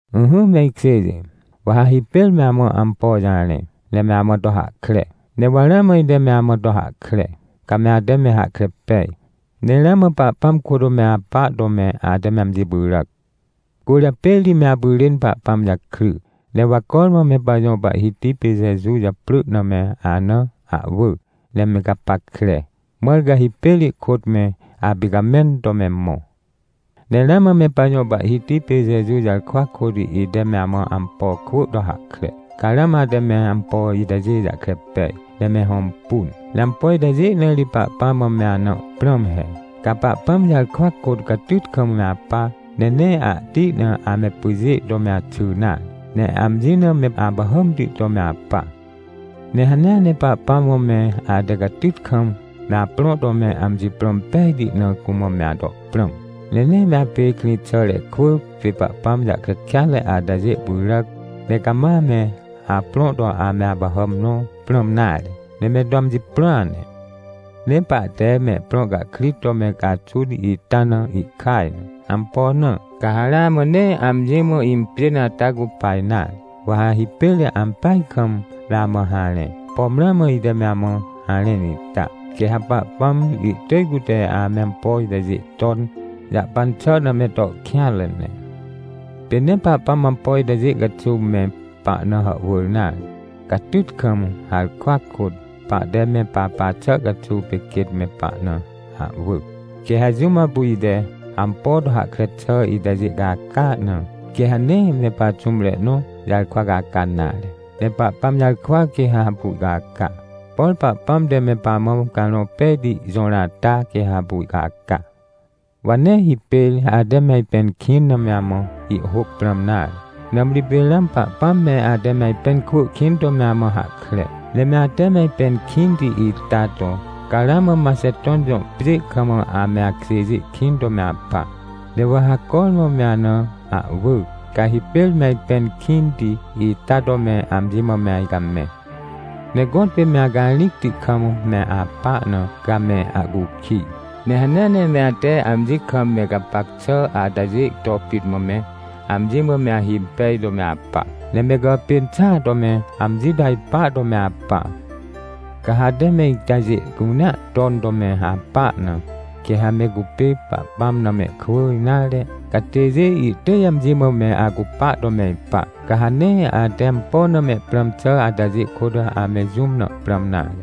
Ỹhỹ me ikjêjê, wa ha hipêr me amã ampo jarẽ, ne me amã to hahkre. Ne wa ramã ite me amã to hahkre, ca me ate me hahkre pej, ne ramã Pahpãm kôt me apa to me ate me amji pyràc. Cwỳrjapê ri me apyrên Pahpãm jakry. Ne wa cormã me pajõ Pahhiti pê Jeju japrỳ na me ana ahwỳ ne me gapackre, mãr ca hipêr ihkôt me apicamẽn to me mõ. Ne ramã me pajõ Pahhiti pê Jeju jarkwa kôt ite me amã ampo kwỳ to hahkre, ca ramã ate me ampo itajê jahkre pej, ne me hõmpun. Ne ampo itajê na ri Pahpãm mã me ana prãm he: Ca Pahpãm jarkwa kôt catyt kam me apa. Ne nee ahti na ame pyjê to me axy nare. Ne amji na me apahàmti to me apa. Ne hanea ne Pahpãm mã me ate catyt kam me aprõ to me amji prõ impejti na cumã me ato prãm. Ne nee me apê krĩxàre kwỳ pê Pahpãm jahkre kêatre atajê pyràc, ne cama me aprõ to ame apahàm nõ prãm nare, ne me to amji prõa ne. Ne pahte mehprõ cahkrit to me caxun ita na ihkaj na. Ampo na? Ca ha ramã nee amji mã impjên ata cupa nare. Wa ha hipêr ampeaj kam me amã harẽ, pom ramã ite me amã harẽn ita, quê ha Pahpãm ihtỳj cute ame ampo itajê ton jahpan xà na me to kêanre ne. Pê nee Pahpãm ampo itajê caxuw me pahna hàhwỳr nare. Catyt kam, harkwa kôt, pahte me papa xà caxuw pê quêt me pahna ahwỳ. Quê ha jũm apu ite ampo to hahkre xà itajê caca na, quê ha nee me paxũmre nõ jarkwa caca nare, ne Pahpãm jarkwa quê ha apu ihcaca. Por Pahpãm te me pamã Carõ Pejti jõr ata quê ha apu ihcaca. Wa nee hipêr ate me ajpẽn kĩn na me amã ihhôc prãm nare. Nãmri pê ramã Pahpãm me ate me ajpẽn kwỳ kĩn to me amã hahkre. Ne me ate me ajpẽn kĩnti ita to, ca ramã Maxeton jõ pjê kam ame akjêjê kĩn to me apa. Ne wa ha cormã me ana ahwỳ, ca hipêr me ajpẽn kĩnti ita to me amji mã me ajcamẽ. Ne gõtpê me acarĩcti kam me apa na, ca me ahcukij. Ne hanea ne me ate amji kam me gapac xà atajê to pit mã me amji mã me ahimpej to me apa. Ne me gàpên xàa to me amji to ajpa to me apa. Ca ha ate me itajê cunea ton to me apa na, quê ha me cupê Pahpãm na mehkwỳ nare catêjê ihtỳj amji mã me acupa to me ipa. Ca ha nee ate ampo na me prãm xà atajê kôt ame jũm na prãm nare.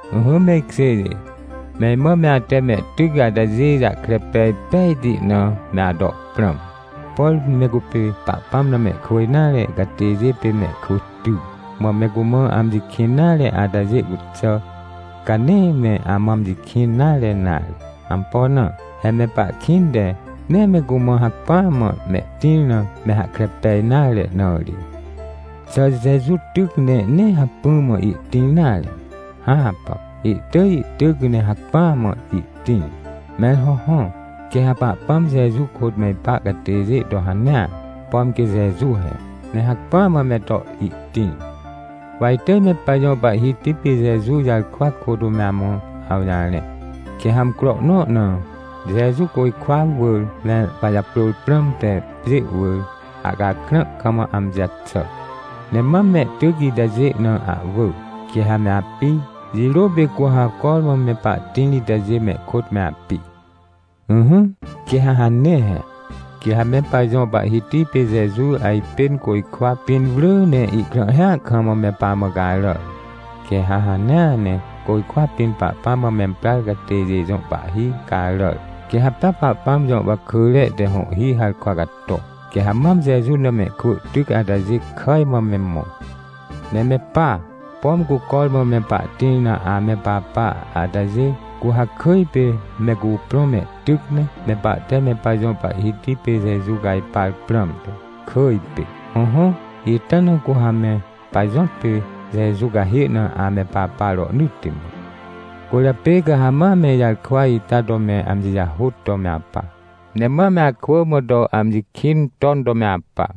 Ỹhỹ me ikjêjê, me imã me ate mehtyc atajê jahkre pej pejti na me ato prãm. Por me cupê Pahpãm na mehkwỳ nare catêjê pê mehkwỳ ty, mã me cumã amji kĩn nare atajê cuxà, ca nee me amã amji kĩn nare nare. Ampo na? He me pahkĩnte nee me cumã hacpỹa mã mehtĩr na me hahkre pej nare na ri. Xà Jeju tyc ne nee hacpỹ mã ihtĩr nare? Hãpà, ihtỳj ihtyc ne hacpỹa mã ihtĩr! Mẽr hõhõ, quê ha Pahpãm Jeju kôt me ipa catêjê to hanea, pom quê Jeju he, ne hacpỹa mã me to ihtĩr. Wa itỳj me pajõ Pahhiti pê Jeju jarkwa kôt me amã awjarẽ. Quê ha amcro nõ na, Jeju côjkwa wỳr me pajaprôr prãmte pjê wỳr, ahcakrã kam, amji jaxà. Ne mam mehtyc itajê na ahwỳ, quê ha me api. Jirô pê cu ha cormã me pahtĩr itajê mehkôt me api. Ỹhỹ, quê ha hane he. Quê ha me pajõ Pahhiti pê Jeju ajpên côjkwa pĩn wrỳ ne ihkrãhhia kam me pamã caràr. Quê ha hanea ne côjkwa pĩn Pahpãm mã memprar catêjê jõ pahhi caràr, quê ha pea Pahpãm jõ wakỳre te hõhhi harkwa cato. Quê ha mam Jeju na mehkwỳ tyc atajê kàj mã me mõ. Ne me pa, pom cu cormã me pahtĩr na ame papa atajê, cu ha kỳj pê me cuprõ mehtyc me, me pahte me pajõ Pahhiti pê Jeju cajpar prãmte, kỳj pê. Hõhõ, ita na cu ha me pajõtpê Jeju cahê na ame papa rohnỳtti mã. Cwỳrjapê ca ha ma me ijarkwa ita to me amji jahôt to me apa. Ne ma me akwỳ mã to amji kĩn ton to me apa.